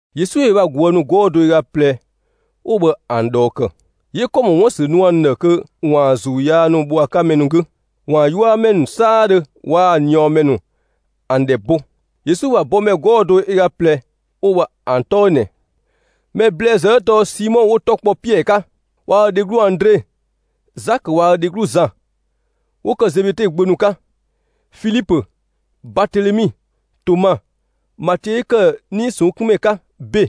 Yesu ‑yö ö bha ꞊guë' ‑nu 'gɔɔ‑ do ö ga ꞊plɛ 'wo bhë ‑an ꞊dhɔɔ ‑kë, 'yö ‑kɔ ‑mɔ 'wun ‑bha ‑sü nu ‑an ‑dhë kö ‑waan ‑zuu yaa ‑nu bho ‑a 'ka mɛ ‑nu 'gü, ‑waan 'yuamɛ ‑nu 'saadhö waa‑ ꞊niɔɔmɛ ‑nu ‑an ‑dhɛ bo. Yesu ‑bha bɔmɛ 'gɔɔ‑ do ö ga ꞊plɛ 'wo bhë ‑an 'tɔ 'ö ꞊nɛ: Mɛ ‑blɛɛzë 'ö tɔɔ Simɔ 'wo‑ 'tɔ kpɔ Piɛɛ 'ka, waa‑ ö dheglu Andre; Zakö waa‑ ö dheglu Zan, 'wo ‑kë Zebede gbö ‑nu 'ka; Filipö, Baatelemi, Toma, Matiö 'yö ‑kë 'nii‑ ꞊sɔnng' 'kun ‑mɛ 'ka ‑be;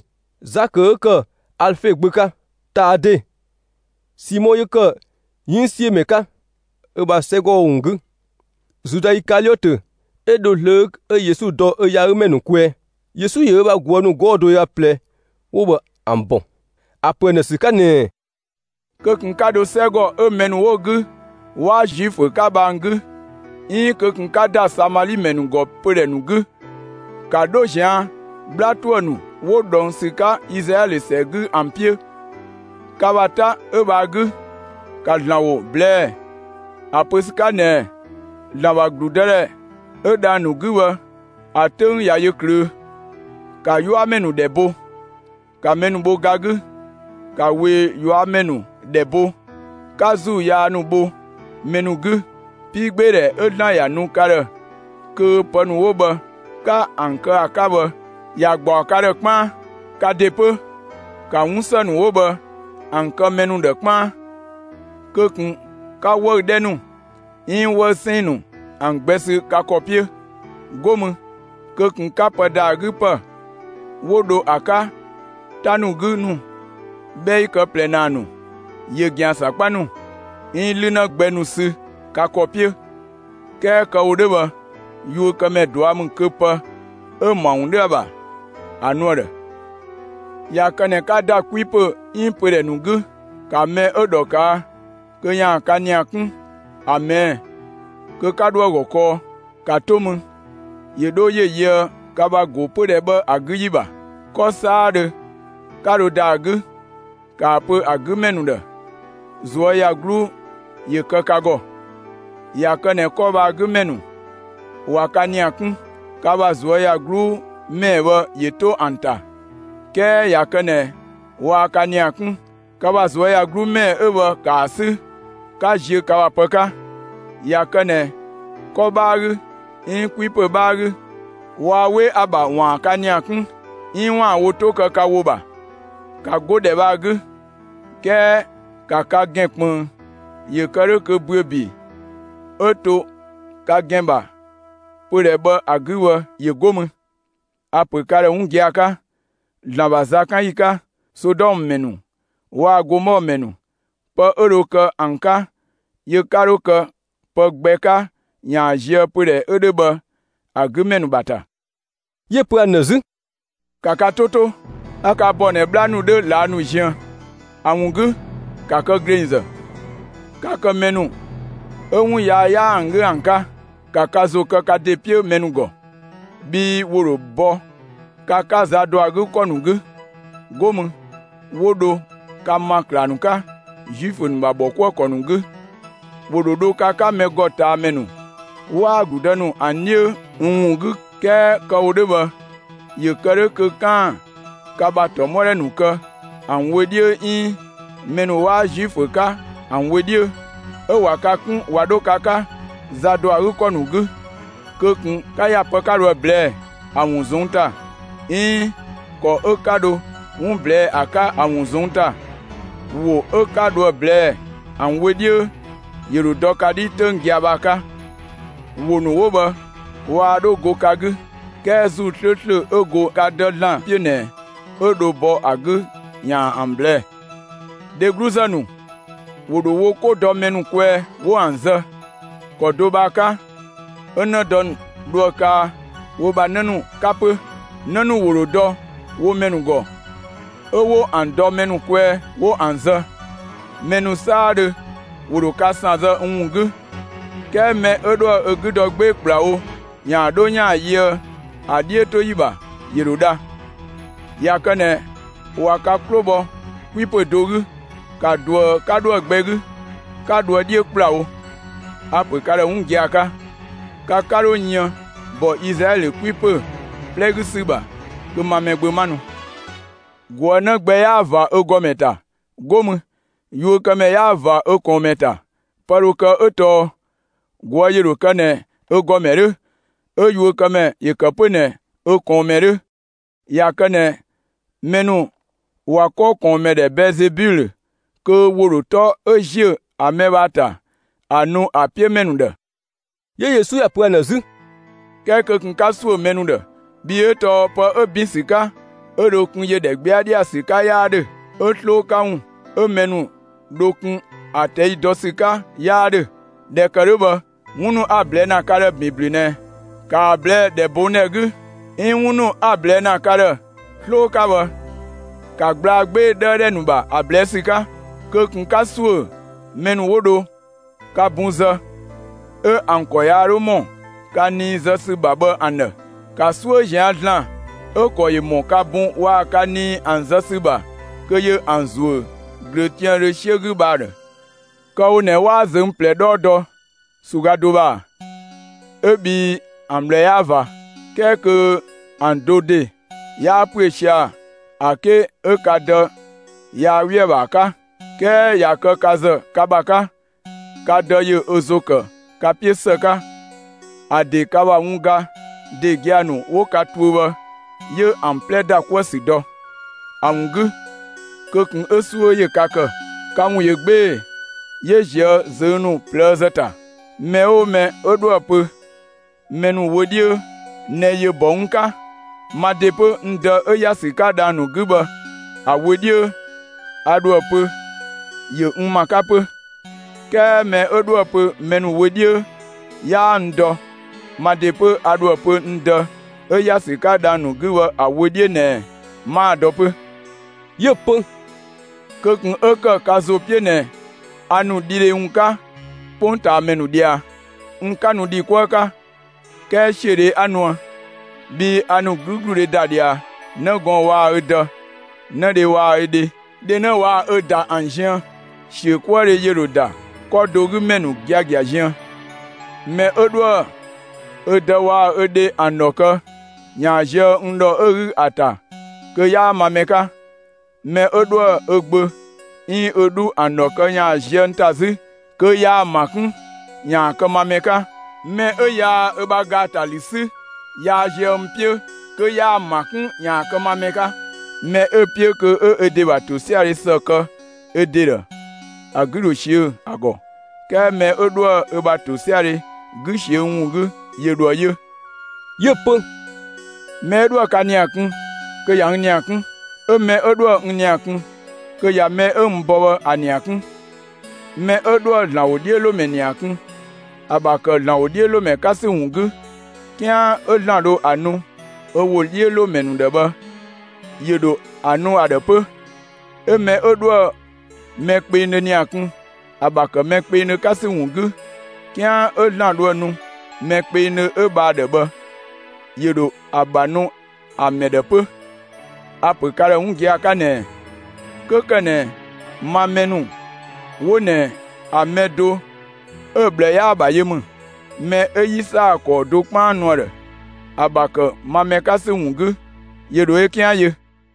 Zakö 'ö ‑kë Alefe gbö 'ka; Taade, Simɔ 'yö ‑kë 'yënngsiömɛ 'ka ö ‑bha 'sɛgɔ ‑wun 'gü, Zuda Ikaliɔtö 'ö dho zlöö 'ö Yesu dɔ ö yaagümɛ ‑nu kwɛɛ. Yesu ‑yö ö bha ꞊guë' ‑nu 'gɔɔ‑ do ö ga ꞊plɛ 'wo bhë ‑an ‑bɔ, ‑a ‑pö ‑an ‑dhë ‑sü 'ka ꞊nɛɛ: «Kö ꞊kun 'ka dho 'sɛgɔ 'ö mɛ ‑nu 'wo‑ 'gü, 'waa Zuifö 'ka bhë ‑an 'gü, 'iin kö ꞊kun 'ka ‑da Samali ‑mɛ ‑nu ‑gɔ pödhɛ ‑nu 'gü! ‑Ka 'dho ꞊zian' 'bhla ‑tuë ‑nu 'wo ꞊dhɔng' ‑sü 'ka Izlaɛlö ‑sɛ 'gü ‑an 'piö! Ka ‑bha 'ta 'ö bhë ‑a 'gü, ‑ka ‑Zlan ‑wo ꞊blɛɛ'‑ ‑a pö ‑sü 'ka ꞊nɛɛ: ‹‑Zlan ‑bha ‑gludëdhɛ 'ö dhang‑ ‑nu 'gü bhë, ‑a 'töng ꞊ya yö ꞊klöö'.› ‑Ka 'yuamɛ ‑nu ‑dhɛ bo, 'ka mɛ ‑nu bho ga 'gü, ‑ka ꞊wee ꞊yuamɛ ‑nu ‑dhɛ bo, 'ka ‑zuu yaa ‑nu bho mɛ ‑nu 'gü! 'Piigbeedhɛ 'ö ‑Zlan ‑ya nu ka ‑dhë kö pë ‑nu 'wo bhë 'ka ‑an kë ‑a 'ka bhë, ‑ya gbaɔ ka ‑gɔ 'kpaan. Ka ‑de 'pö, ‑ka 'wunsë ‑nu 'wo bhë ‑an kë mɛ ‑nu ‑dhë 'kpaan. Kö ꞊kun 'ka 'wëü‑ 'dhɛ ‑nu, 'iin 'wëü‑ 'sɛɛn‑ ‑nu ‑an gbɛ sü ka ‑kɔ 'piö! 'Go mü, kö ꞊kun 'ka pë ‑da ‑a 'gü ‑pë 'wo dho ‑a 'ka 'ta ‑nu 'gü ‑nu, 'bhɛi kë ꞊plɛ ‑naa ‑nu, ‑yö ‑gɛan ‑sakpa ‑nu, 'iin 'lünë gbɛ ‑nu sü ka ‑kɔ 'piö! 'Kɛɛ kë‑ wo 'dhö bhë, yuökëmɛ ꞊dua' ‑mü kö pë 'ö‑ ‑bha ‑wun 'dhö ‑a ‑bha ‑a nu ‑a ‑dhë. ꞊Ya kë ꞊nɛ 'ka ‑da 'kwi ‑pö 'iin pödhɛ ‑nu 'gü, ‑ka mɛ 'ö ‑dhɔ ꞊kaa', kö ‑yaan ka ‑nia 'kun ‑a ꞊mɛɛ', kö 'ka 'dho ‑a ‑gɔ kɔɔ; ‑ka 'to mü, ‑yö 'dho ‑yö yöë ka ‑bha ‑go pödhɛ bhë ‑a 'gü ‑yi ‑bha. 'Kɔ 'saadhö 'ka dho ‑da ‑a 'gü, ‑ka ‑a pö ‑a 'gü ‑mɛ ‑nu ‑dhë: ‹꞊Zuöyagluu ‑yö kë ka ‑gɔ!› ꞊Ya kë ꞊nɛ 'kɔ bhë ‑a 'gü ‑mɛ ‑nu ꞊wa ka ‑nia 'kun, ka ‑bha ꞊zuöyagluu ‑mɛɛ bhë ‑yö 'to ‑an ‑ta. 'Kɛɛ ꞊ya kë ꞊nɛ waa ka ‑nia 'kun, ka ‑bha ꞊zuöyagluu ‑mɛɛ 'ö bhë ‑ka ‑a 'sü 'ka ziö ka ‑bha pë 'ka! ꞊Ya kë ꞊nɛ 'kɔ 'bhaa 'gü, 'iin 'kwipö 'bhaa 'gü, waa 'we ‑a ‑bha ‑waan ka ‑nia 'kun, 'iin ‑waan wo 'to kë ka ‑wo ‑bha, ‑ka 'go ‑dhɛ bhë ‑a 'gü; 'kɛɛ ‑ka ka ‑gɛn ꞊kpënng ‑yö kë 'dhö kö ‑büö ‑bi 'ö to ka ‑gɛn ‑bha pödhɛ bhë ‑a 'gü bhë ‑yö 'go mü. A‑ ‑pö ka ‑dhë 'wun gia‑ 'ka, ‑Zlan ‑bha zakanyi 'ka, Sodɔmë ‑mɛ ‑nu waa‑ Gomɔɔ ‑mɛ ‑nu, pë 'ö dho kë ‑an 'ka, yö 'ka 'dho kë pë gbɛ 'ka ‑yaan zië pödhɛ 'ö 'dhö bhë ‑a 'gü ‑mɛ ‑nu ‑bha ‑ta.» 'Yö‑ pö ‑an ‑dhë 'zü: «‑Ka ka 'to 'to, a ka ‑bɔ ꞊nɛ 'bhla ‑nu 'dhö ꞊laa' ‑nu ziën. ‑A ‑wun 'gü, ‑ka kë ‑glengzë, 'ka kë mɛ ‑nu 'ö 'wun yaa 'yaa ‑an 'gü ‑an 'ka! ‑Ka ka ‑zo kë ka ‑de 'piö mɛ ‑nu ‑gɔ, bhii ‑wo ‑dho bɔ ka 'ka za ‑dɔ ‑a 'gü ‑kɔ ‑nu 'gü; 'go mü 'wo dho ka ‑ma ‑klaaga ‑nu 'ka, Zuifö ‑nu ‑bha ‑bhɔkuëkɔ ‑nu 'gü. ‑Wo ‑dho dho ka 'ka mɛ ‑gɔ ꞊taa ‑mɛ ‑nu waa‑ ‑gludë ‑nu ‑an 'dhiö n ‑wun 'gü; 'kɛɛ kë‑ wo 'dhö bhë ‑yö ‑kë 'dhö kö 'kaan‑ ka ‑bha ‑tɔmɔdhɛ ‑nu kë ‑an wö 'dhiö 'iin mɛ ‑nu 'waa Zuifö 'ka ‑an wö 'dhiö. 'Ö ꞊wa ka 'kun ꞊wa 'dho ka 'ka za ‑dɔ ‑a 'gü ‑kɔ ‑nu 'gü, kö ꞊kun 'ka ‑ya pë 'ka dho ‑a ꞊blɛɛ'‑ ‑a ‑wun ꞊zɔnng' ‑ta 'iin ‑kɔ 'ö 'ka dho 'wun ꞊blɛɛ'‑ ‑a 'ka ‑a ‑wun ꞊zɔnng' ‑ta! ‑Wo 'ö 'ka dho ‑a ꞊blɛɛ'‑ ‑an wö 'dhiö, ‑yö ‑dho dɔ ka 'dhi 'töng gia‑ bhë ‑a 'ka. ‑Wo ‑nu 'wo bhë waa 'dho go ka 'gü, 'kɛɛ ‑Zuu 'slööslö 'ö go ka Dë ‑Zlan 'piö ꞊nɛ, 'ö dho bɔ ka 'gü ‑yaan ‑an ꞊blɛɛ'‑. Dhegluzë ‑nu ‑wo ‑dho wo 'ko dɔ mɛ ‑nu kwɛɛ 'wo ‑an zë. ‑Kɔ do bhë ‑a 'ka, 'ö 'në dë ‑nu dho ‑a kaa wo bha 'në ‑nu 'ka 'pö. 'Në ‑nu ‑wo ‑dho dɔ wo mɛ ‑nu ‑gɔ, 'ö 'wo ‑an dɔ mɛ ‑nu kwɛɛ 'wo ‑an zë. Mɛ ‑nu 'saadhö ‑wo ‑dho ka ‑san zë n ‑wun 'gü, 'kɛɛ mɛ 'ö 'dhoë‑ ö 'gü dɔ 'gbee‑ ‑kplawo ‑yaan 'dho ‑yaan yöë ‑a 'dhiötoyi ‑bha, ‑yö ‑dho dha. ꞊Ya kë ꞊nɛ ꞊wa ka 'klo bhɔ 'kwi ‑pö do 'gü, ‑ka ꞊duë 'ka 'dho ‑a gbɛ 'gü, 'ka dhoë 'dhiö ‑kplawo! A‑ ‑pö ka ‑dhë 'wun gia‑ 'ka: Ka 'ka 'dho yën ‑bɔ Izlaɛlö 'kwipö 'plɛ 'gü ‑sü ‑bha kö ma Mɛgbö 'ma nu. ꞊Guë' 'në gbɛ 'yaa ꞊va ö ‑gɔmɛ ‑ta. 'Go mü, yuökëmɛ 'yaa ꞊va ö ꞊kɔɔnmɛ ‑ta. Pë dho kë 'ö tɔɔ ꞊guë' ‑yö ‑dho kë ꞊nɛ ö ‑gɔmɛ 'dhö, 'ö yuökëmɛ ‑yö ‑kë 'pö ꞊nɛ ö ꞊kɔɔnmɛ 'dhö. ꞊Ya kë ꞊nɛ mɛ ‑nu ꞊wa 'kɔ ꞊kɔɔnmɛ ‑dhɛ Bɛɛzebilö kö ‑wo ‑dho 'tɔ 'ö ‑ziö ‑a mɛ 'ö bhë ‑a ‑ta, ‑a nu ‑a 'piö ‑mɛ ‑nu ‑dhë.» 'Yö Yesu ‑ya pö ‑an ‑dhë 'zü: «'Kɛɛ kö ꞊kun 'ka ‑suö mɛ ‑nu ‑dhë! Bhii 'ö tɔɔ pë 'ö ‑bin ‑sü 'ka 'ö dho kun ‑yö ‑dhɛgbɛadhɛ 'gü ‑sü 'ka 'yaa 'dhö, 'ö 'sloo 'ka ‑wun 'ö mɛ ‑nu dho kun ‑a ꞊tɛi' dɔ ‑sü 'ka 'yaa 'dhö. ꞊Dhɛ ‑kë 'dhö bhë, 'wun ‑nu 'a‑ ꞊blɛɛ'‑ ‑na ka ‑dhë ‑bin ‑blü ꞊nɛ, ‑ka ‑a ꞊blɛɛ'‑ ‑dhɛbongdhɛ 'gü, 'iin 'wun ‑nu 'a‑ ꞊blɛɛ'‑ ‑na ka ‑dhë 'sloo 'ka bhë, ‑ka gblaa 'gbee‑ 'ka 'dhëëdhɛ ‑nu ‑bha, ‑a ꞊blɛɛ' ‑sü 'ka! Kö ꞊kun 'ka ‑suö mɛ ‑nu 'wo dho ka bun zë, 'ö ‑an ‑kɔ yaa 'dho ‑mɔ ka nii zë ‑sü ‑bha bhë ‑an ‑dhë! ‑Ka 'suö ꞊zian' ‑Zlan 'ö‑ ‑kɔ ‑yö ‑mɔ ka bun waa‑ ka nii ‑an zë ‑sü ‑bha kö ‑yö ‑an ‑zuö ꞊glöötiaandhö 'siö 'gü bhë ‑a ‑dhë! Kë 'ö‑ wo ꞊nɛ 'waa ꞊zöng' ꞊plɛ 'dhɔɔ dɔ ‑su ga do ‑bha ‑a? ('Ö bhii ‑an ꞊bhlë 'yaa ꞊va); 'kɛɛ kö ‑an do ‑de 'yaa ‑püö sia‑ ‑a 'ke 'ö ka Dë yaa 'we ‑a ‑bha ‑a 'ka. 'Kɛɛ ꞊ya kë ka ‑zë ka ‑bha 'ka, ka Dë ‑yö ö ‑zo ‑kë ka 'piö ‑së 'ka, ‑a ‑de ka ‑bha wun ga ‑de gia‑ ‑nu 'wo ka tuö bhë, 'yö ‑an 'plɛ ‑da 'kuë‑ ‑sü dɔ. ‑A ‑wun 'gü, kö ꞊kun 'ö 'suö ‑yö ka ‑kë; ka ‑wun ꞊yö 'gbee‑ 'yö ꞊zië' ꞊zöng' ‑nu ꞊plëëzë ‑ta. Mɛ 'oo mɛ 'ö 'dhoë‑ pö mɛ ‑nu wö 'dhiö ꞊nɛ ‑yö ‑bɔ n 'ka, ma ‑de 'pö, n Dë 'ö ‑ya ‑sü 'ka dhang‑ ‑nu 'gü bhë ‑a wö 'dhiö, a ‑dho ‑a pö ‑yö n ‑ma 'ka 'pö. 'Kɛɛ mɛ 'ö 'dhoë‑ pö mɛ ‑nu wö 'dhiö 'yaa n dɔ, ma ‑de 'pö, a ‑dho ‑a pö n Dë 'ö ‑ya ‑sü 'ka dhang‑ ‑nu 'gü bhë ‑a wö 'dhiö ꞊nɛ 'maa‑ dɔ 'pö.» 'Yö‑ pö: «Kö ꞊kun 'ö ‑kë ka ‑zo 'piö ꞊nɛ a ‑nu dhidhe ‑wun 'ka 'kpongtaamɛ ‑nu ꞊dhia. N 'ka nu ‑dhi 'kuë 'ka, 'kɛɛ ‑siödhe 'a nuë. Bhii a ‑nu 'gügludhe ‑da ꞊dhia 'në gɔɔn‑ waa‑ ö dë, 'në dhe waa‑ ö dhe, dhe 'në waa‑ ö ꞊da ‑an ziën. ‑Siökuëdhe ‑yö ‑dho ‑da 'kɔ do 'gü ‑mɛ ‑nu giagia ziën. Mɛ 'ö 'dhoë‑ ö dë waa‑ ö dhe ‑an ‑dhɔ kë ‑yaan zië n ‑dhɔ 'ö‑ 'gü ‑a ‑ta kö 'yaa ma mɛ 'ka. Mɛ 'ö 'dhoë‑ ö gbö 'iin ö 'dhu ‑an ‑dhɔ kë ‑yaan zië n ‑ta 'zü kö yaa‑ ‑ma 'kun kö ‑yaan kë ma mɛ 'ka. Mɛ 'ö yaa ö ‑bha ‑gaatalü 'sü yaa zië n 'piö kö yaa‑ ‑ma 'kun ‑yaan kë ma mɛ 'ka. Mɛ 'ö‑ 'piö kö 'ö ö ‑bha ‑tosiadhe ‑së kë ö ‑de ‑dhë, ‑a 'gü ‑dho ꞊siö' ‑a ‑gɔ; 'kɛɛ mɛ 'ö 'dhoë‑ ö ‑bha ‑tosiadhe 'gü ꞊siö' n ‑wun 'gü, ‑yö ‑dho ‑a yö.» 'Yö‑ pö: «Mɛ 'ö 'dhoë‑ ka ‑nia kun, kö ꞊ya n ‑nia 'kun. 'Ö mɛ 'ö 'dhoë‑ n ‑nia kun kö ꞊ya mɛ 'ö n bɔ bhë ‑a ‑nia 'kun. Mɛ 'ö 'dhoë‑ ‑Zlan ‑wodhiölomɛ ‑nia kun, ‑a ‑bha ‑kë ‑Zlan ‑wodhiölomɛ 'ka ‑sü ‑wun 'gü, 'kian 'ö ‑Zlan dho ‑a nu ö ‑wodhiölomɛ ‑dhë bhë ‑yö ‑dho ‑a nu ‑a ‑dhë 'pö. 'Ö mɛ 'ö 'dhoë‑ mɛ kpengdhö ‑nia kun, ‑a ‑bha ‑kë mɛ kpengdhö 'ka ‑sü ‑wun 'gü, 'kian 'ö ‑Zlan dho ‑a nu mɛ kpengdhö 'ö bhë ‑a ‑dhë bhë ‑yö ‑dho ‑a ‑bha nu ‑a mɛ ‑dhë 'pö. A‑ ‑pö ka ‑dhë 'wun gia‑ 'ka ꞊nɛɛ: 'Kö ‑kë ꞊nɛ ma mɛ ‑nu 'wo ꞊nɛ ‑a mɛ do 'ö‑ ꞊bhlë 'yaa‑ ‑bha yö ‑mü, mɛ 'ö 'yi ‑saa ‑kɔɔ do 'kpaan nu ‑a ‑dhë, ‑a ‑bha ‑kë ma mɛ 'ka ‑sü ‑wun 'gü, ‑yö ‑dho ö 'kian yö.»